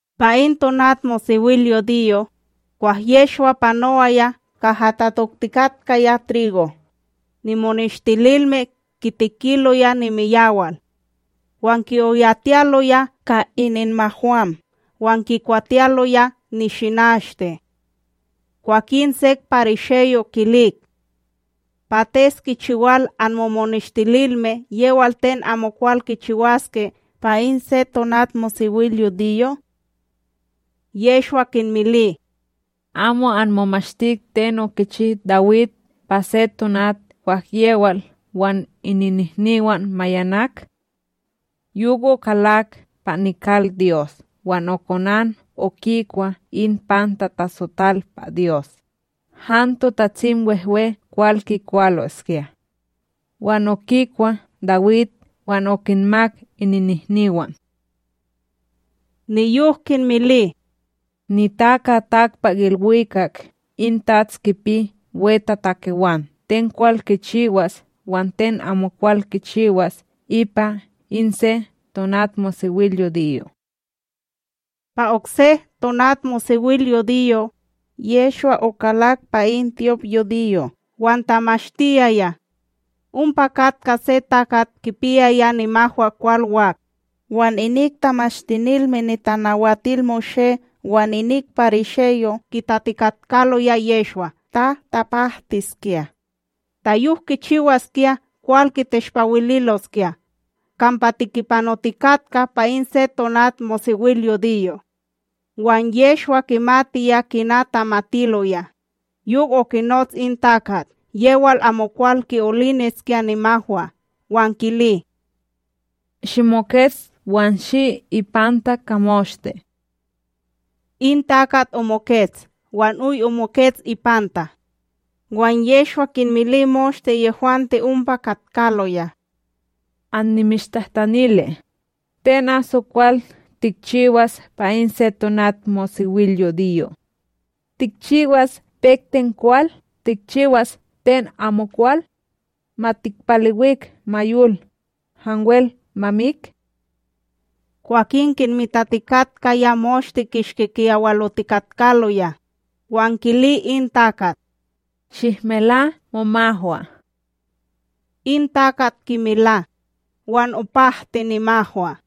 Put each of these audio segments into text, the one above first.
Pa in tonatmosewilyudiyo, kwah Yehshwa panowaya kaha tatoktikatkaya trigo, nimoneshtililme kitekiloya nimiyawal; wan ki'oyalotiyaloya ka ininmahwam wan kikwatiyaloya nishinashte. Kwakin sek parisheyo' kilik: ―Pates kichiwal anmomoneshtililme yewal ten amokwal kichiwaske pa in se tonatmosewilyudiyo? Yehshwa kinmili: ―Amo anmomashtik ten okichi Dawid pa se tonat kwah yewal wan ininnihniwan mayanak? Yok okalak pa nikalDyos wan okonan okikwa in pan tatasotal pa Dyos, han TotatsimWehwe kwal kikwaloskya, wan okikwa Dawid wan okinmak ininnihniwan. Niyok kinmili: ―NitakaTakpakIlwikak in TATS kipi wetatakewan ten kwal kichiwas wan ten amokwal kichiwas ipa in se tonatmosewilyudiyo. Pa okse tonatmosewilyudiyo, Yehshwa okalak pa in tyopYudiyo wan tamashtiyaya. Ompa katka se takat kipiyaya nimahwakwal wak; wan inik Tamashtinilme NitanawatilMoshé wan inik parisheyo' kitatikatkaloya Yehshwa ta tapahtiskya, ta yok kichiwaskya kwal kiteshpawililoskya kampa tikipanotikatka pa in se tonatmosewilyudiyo. Wan Yehshwa kimatiya kina tamatiloya, yok okinots in takat yewal amokwal ki'oliniskya nimahwa wan kili: ―Shimokets wan shi ipanta ka moshte. In takat omokets wan oy omokets ipanta. Wan Yehshwa kinmili moshte yehwante ompa katkaloya: ―Annimishtahtanili: Ten aso kwal tikchiwas pa in se tonatmosewilyudiyo, tikchiwas pek ten kwal tikchiwas ten amokwal? Ma tikpalewik ma yol, hanwel ma mik? Kwakin kinmitatikatkaya moshte kishki kiyawalotikatkaloya, wan kili in takat: ―Shihmela momahwa. In takat kimela, wan opahti nimahwa.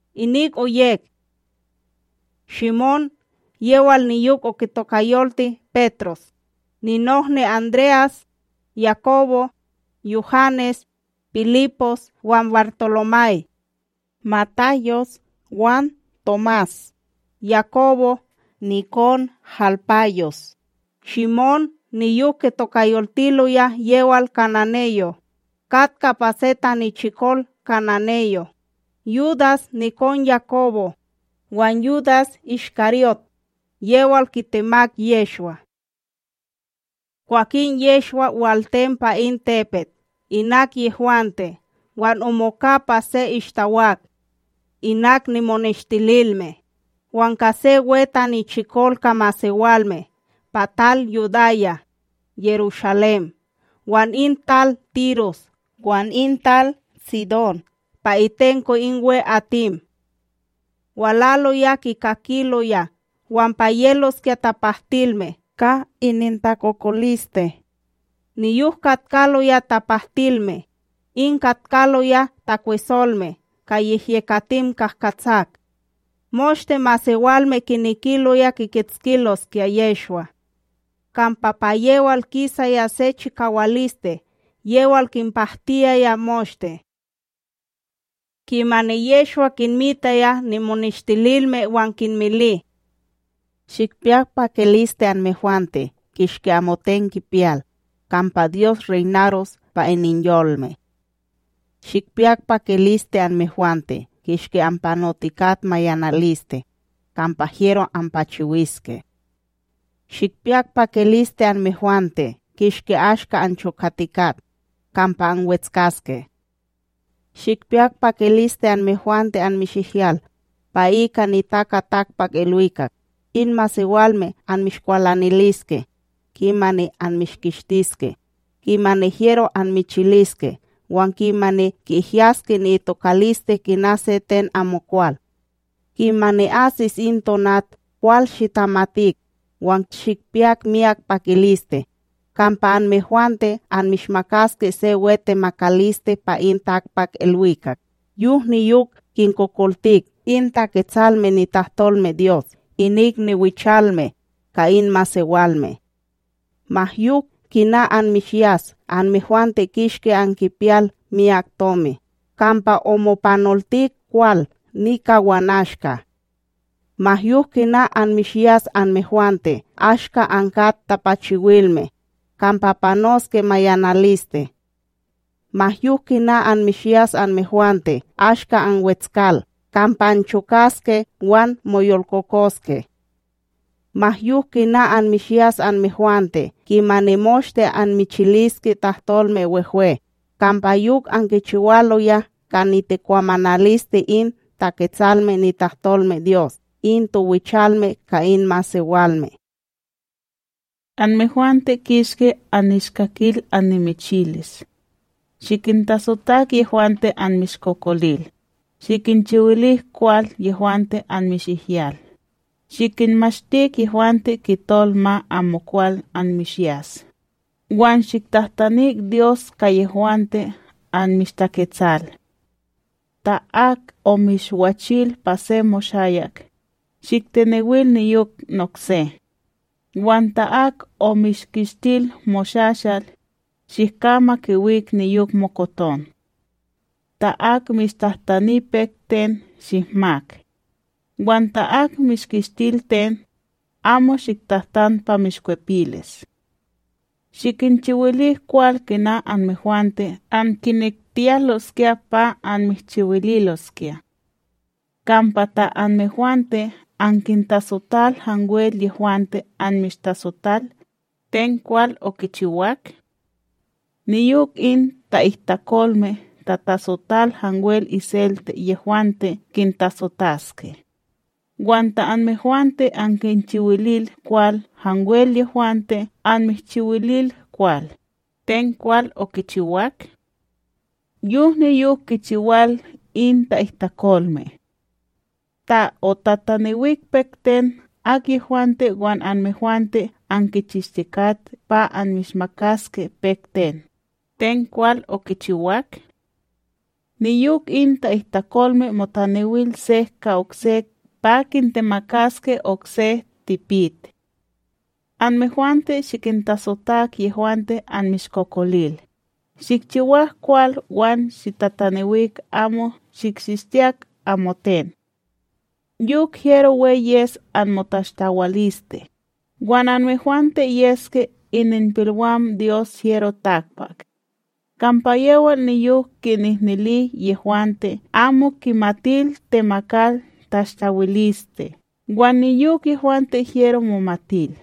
Inik oyek: Shimón yewal niyok okitokayolti Petros; ninohni André'as, Yakobo, Yuhanes, Pilipos wan BarTolomay, Matayos, wan Tomás, Yakobo nikon Halpayos; Shimón niyok kitokayoltiloya yewal kananeyo, katka pa se tanichikol kananeyo; Yudas nikon Yakobo; wan Yudas IshKaryót, yewal kitemak Yehshwa. Kwakin Yehshwa waltem pa in tepet inak yehwante wan omoka pa se ishtawak, inak nimoneshtililme; wan ka se we tanichikol ka masewalme pa tal Yudaya, Yerushalém wan in tal Tiros wan in tal Tsidón pa itenko in we'atim. Walaloya kikakiloya wan pa yeloskya tapahtilme ka inintakokoliste. Niyok katkaloya tapahtilme, in katkaloya takwesolme ka yehyekatim kahkatsak. Moshte masewalme kinekiloya kikitskiloskya Yehshwa, kampa pa yewal kisaya se chikawaliste yewal kinpahtiyaya moshte. Kimani Yehshwa kinmitaya nimoneshtilime wan kinmili: ―Shikpiyak pakiliste anmehwante kishki amoten kipiyal, kampa Dyos reynaros pa ininyolme. ’Shikpiyak pakiliste anmehwante kishki anpanotikat mayanaliste, kampa hyero anpachiwiske. ’Shikpiyak pakiliste anmehwante kishki ashka anchokatikat, kampa anwetskaske. ’Shikpiyak pakiliste anmehwante anmishihyal, pa ika NitakaTakpakIlwikak, in masewalme anmishkwalaniliske, kimani anmishkishtiske, kimani hyero anmichiliske wan kimani ki'ihyaske ni'itokaliste kina se ten amokwal. Kimani asis in tonat kwal shitamatik wan shikpiyak miyak pakiliste, kampa anmehwante anmishmakaske se we temakaliste pa in takpakIlwikak; yok niyok kinkokoltik in Taketsalme nitahtolmeDyos inik niwichalme ka in masewalme. ’Ma yok kina anmishyas anmehwante kishki ankipiyal miyak tomi, kampa omopanoltik kwal nika wan ashka. ’Ma yok kina anmishyas anmehwante ashka ankat tapachiwilme, kampa panoske mayanaliste. ’Ma yok kina anmishyas anmehwante ashka anwetskal, kampa anchokaske wan moyolkokoske. ’Ma yok kina anmishyas anmehwante kimani moshte anmichiliske tahtolme wehwe, kampa yok ankichiwaloya ka nitikwamanaliste in Taketsalme nitahtolmeDyos in towichalme ka in masewalme. ’Anmehwante kishki annishkakil annimichilis: Shikintasotak yehwante anmishkokolil, shikinchiwilik kwal yehwante anmishihyal, shikinmashtik yehwante kitol ma amokwal anmishyas, wan shiktahtanik Dyos ka yehwante anmishtaketsal. Ta ak omishwachil pa se moshayak, shiktenewil niyok nokse; wan ta ak omishkishtil moshashal, shihka ma kiwik niyok mokoton. Ta ak mishtahtani pek ten shihmak; wan ta ak mishkishtil ten, amo shiktahtan pa mishkwipilis. Shikinchiwilik kwal kina anmehwante ankinektiyaloskya pa anmishchiwililoskya. ’Kampa ta anmehwante ankintasotal hanwel yehwante anmishtasotal, ten kwal okichiwak? Niyok in ta'ihtakolme tatasotal hanwel iselte yehwante kintasotaske. Wan ta anmehwante ankinchiwilil kwal hanwel yehwante anmishchiwilil kwal, ten kwal okichiwak? Yok niyok kichiwal in ta'ihtakolme. Ta otatanewik pek ten akyehwante wan anmehwante ankichishtikat pa anmishmakaske pek ten, ten kwal kichiwak? Niyok in ta'ihtakolme motanewil sek ka oksek pa kintemakaske okse tipit. Anmehwante shikintasotak yehwante anmishkokolil, shikchiwak kwal wan shitatanewik amo shikchishtiyak amoten. Yok hyero we yes anmotashtawaliste, wan anmehwante yeske ininpilwam Dyos HyeroTakpak; kampa yewal niyok kinihnili yehwante amo kimatil temakal tashtawiliste wan niyok yehwante hyero momatil.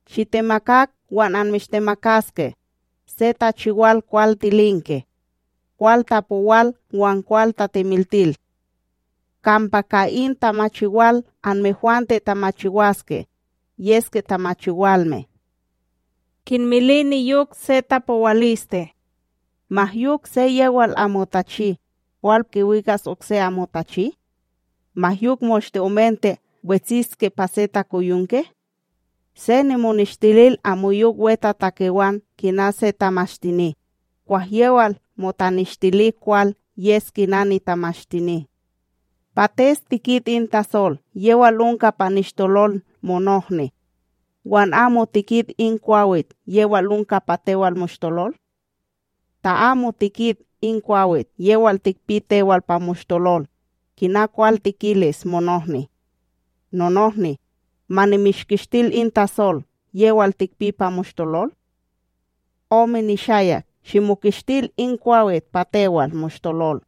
Shitemakak wan anmishmakaske se tamachiwal kwal tilinke, kwal tapowal wan kwal tatemiltilil. Kampa ka in tamachiwal anmehwante tamachiwaske, yeske tamachiwalme. Kinmili niyok se tapowaliste: ―Ma yok se yewal amo tachi, kwal kiwikas okse amo tachi? Ma yok moshte omente wetsitske pa se takoyonke? Se moneshtilil amoyok wetatakewan kina se tamashtini; kwah yewal motanishtili kwal yes kina nitamashtini. ’Pates tikit in tasol yewal onka pa nishtolol monohni, wan amo tikit in kwawit yewal onka pa tewal moshtolol? Ta amo tikit in kwawit yewal tikpi tewal pa moshtolol, kina kwal tikilis monohni: “Nonohni, ma nimishkishtil in tasol yewal tikpi pa moshtolol”? Ome nishayak! Shimokishtil in kwawit pa tewal moshtolol,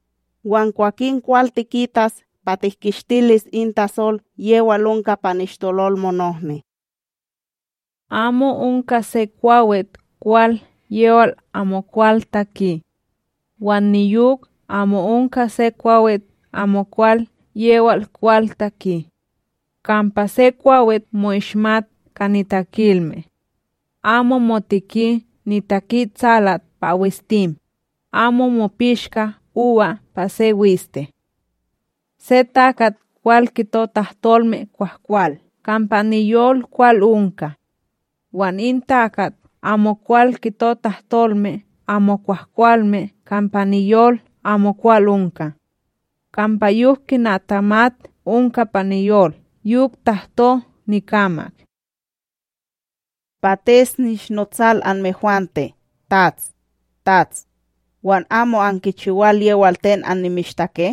wan kwakin kwal tikitas pa tihkishtilis in tasol yewal onka pa nishtolol monohni. ’Amo onka se kwakit kwal yewal amokwal taki; wan niyok amo onka se kwawit amokwal yewal kwal taki. Kampa se kwawit mo'ishmat ka nitakilme: amo moteki nitakiTsalat pa wistim, amo mopishka uba pa se wiste. Se takat kwal kito tahtolme kwahkwal kampa niyol kwal onka; wan in takat amokwal kito tahtolme amo kwahkwalme kampa niyol amokwal onka. Kampa yok kina tamat onka pa niyol yok tahto nikamak. Ome kalme. ’Pates nishnotsal anmehwante, “TATS, TATS”, wan amo ankichiwal yewal ten annimishtake?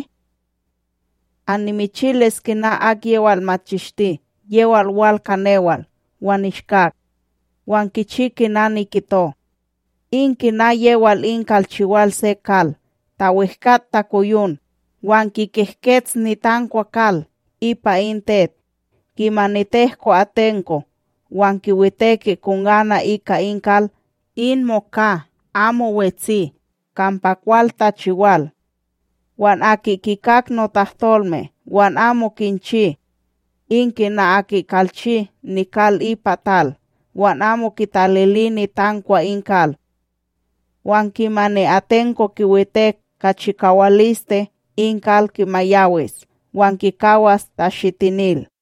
Annimichilis kina akyewal machishti yewal wal ka newal wan nishkak, wan kichi kina nikito: In kina yewal in kalchiwal se kal, ta wehkat takoyon, wan kikehkets nitankwa kal ipa in tet. Kimani tehko atenko, wan kiwiteki kongana ika in kal, in moka amo wetsi kampa kwal tachiwal. Wan aki kikak notahtolme wan amo kinchi, in kina aki kalchi nikal ipa tal, wan amo kitalili nitankwa in kal; wan kimani atenko kiwitek ka chikawaliste in kal kimayawis wan kikawas tashitinil.